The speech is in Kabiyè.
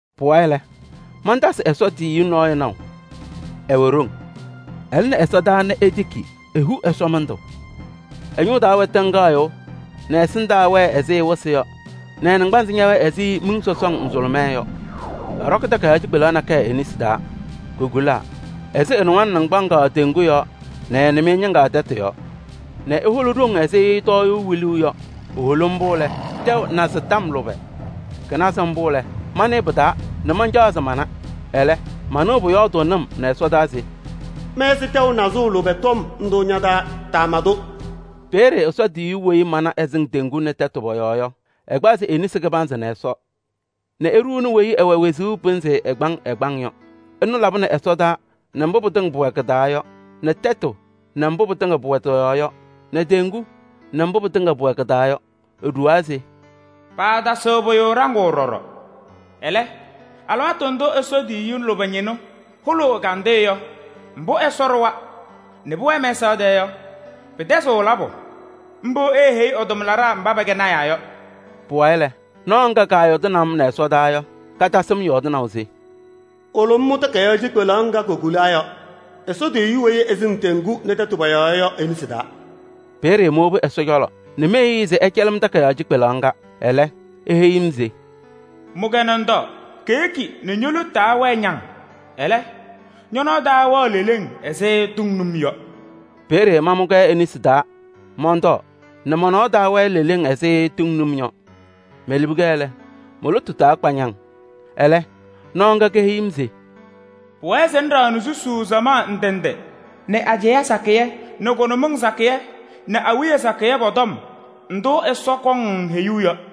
Pʋwayɩ lɛ, mantasɩ Ɛsɔ tiyiyu nɔɔyʋ naʋ, ɛwɛ ɖoŋ. Ɛlɩnɩ ɛsɔdaa nɛ etiki, ehu ɛsɔmɩndʋ. Ɛ-ñʋʋ taa wɛ tɩŋgaɣyʋʋ nɛ ɛ-ɛsɩndaa wɛɛ ɛzɩ wɩsɩ yɔ nɛ ɛ-naŋgbanzɩ ñɛwɛɛ ɛzɩ miŋ sɔsɔŋ nzʋlʋmɛɛ yɔ. Ɛɖɔkɩ takayaɣ cikpelaɣ nakɛyɛ e-nesi taa, kokulaa. Ɛsɩ ɛ-nɩwaŋ naŋgbaŋaɣ teŋgu yɔɔ nɛ nɩmɩyɛ ñɩŋga tɛtʋ yɔɔ nɛ eholi ɖoŋ ɛzɩ tɔɔyʋʋ wiluuu yɔ. Eholi mbʋ lɛ, tɛʋ nazɩ tɔm lʋbɛ. Kɩnaza mbʋ lɛ, manɩɩ pɩ-taa nɛ mancaɣ se mama. Ɛlɛ, manɩɣ pʋyɔɔdʋʋnɩ-m nɛ ɛsɔdaa se: “Mɛsɩ tɛʋ nazʋʋ lʋbɛ tɔm ndʋ ña-taa, taama-tʋ.” Peeye Ɛsɔ tiyiyu weyi mana ɛsɩŋ teŋgu nɛ tɛtʋ pɔ-yɔɔ yɔ, ɛkpazɩ e-nesi kɩbanzɩ nɛ Ɛsɔ nɛ eɖuuni weyi ɛwɛ wezuu pɩnzɩ ɛgbaŋ ɛgbaŋ yɔ. Ɛnʋ labɩnɩ ɛsɔtɔnʋʋ nɛ mbʋ pɩtɩŋa pʋwɛ kɩ-taa yɔ nɛ tɛtʋ nɛ mbʋ pɩtɩŋa pʋwɛ tɩ-yɔɔ yɔ nɛ teŋgu nɛ mbʋ pɩtɩŋa pʋwɛ kɩ-taa yɔ. Eɖuwaa se: “Paatasɩɣ pʋyʋ ɖaŋʋʋ ɖɔɖɔ. Ɛlɛ, alɩwaatʋ ndʋ Ɛsɔ tiyiyu lʋbɛ ñɩnʋ hʋlʋʋ ɛ-ɛgandɩyɛ yɔ mbʋ Ɛsɔ ɖʋwa nɛ pʋwɛɛ mɛsaɣ tɛɛ yɔ pɩtɛzɩɣ labʋ. Mbʋ eeheyi ɛ-tʋmlaɖaa mba pɛkɛ lɔɔyɩsɩ tɩnaa yɔ.” Pʋwayɩ lɛ, nɔɔ ŋga kaayɔɔdɩnɩ-m nɛ ɛsɔdaa yɔ, katasɩ-m yɔɔdɩnaʋ se: “Wolo ŋmʋ takayaɣ cikpelaɣ ŋga kokulaa yɔ, Ɛsɔ tiyiyu weyi ɛsɩŋ teŋgu nɛ tɛtʋ pɔ-yɔɔ yɔ e-nesi taa.” Peeye mowobi ɛ-cɔlɔ nɛ meheyi-i se ɛcɛlɩ-m takayaɣ cikpelaɣ ŋga. Ɛlɛ, eheyi-m se: “Mʋ-kɛ nɛ ŋtɔɔ: keyeki nɛ ño-lotu taa wɛɛ ñaŋ. Ɛlɛ, ñɔ-nɔɔ taa wɛɣ leleŋ ɛzɩ tʋŋ num yɔ.” Peeye mamʋ-kɛ e-nesi taa mɔntɔɔ nɛ mɔ-nɔɔ taa wɛɛ leleŋ ɛzɩ tʋŋ num yɔ. Melibi-kɛ lɛ, mo-lotu taa kpa ñaŋ. Ɛlɛ nɔɔ ŋga keheyi-m se: “Pʋwɛɛ se ŋɖaɣnɩ susuu samaɣ ndɩ ndɩ nɛ ajɛɛ sakɩyɛ nɛ kʋnʋmɩŋ sakɩyɛ nɛ awiya sakɩyɛ pɔ-tɔm ndʋ Ɛsɔ kɔŋ-ŋ heyuu yɔ.”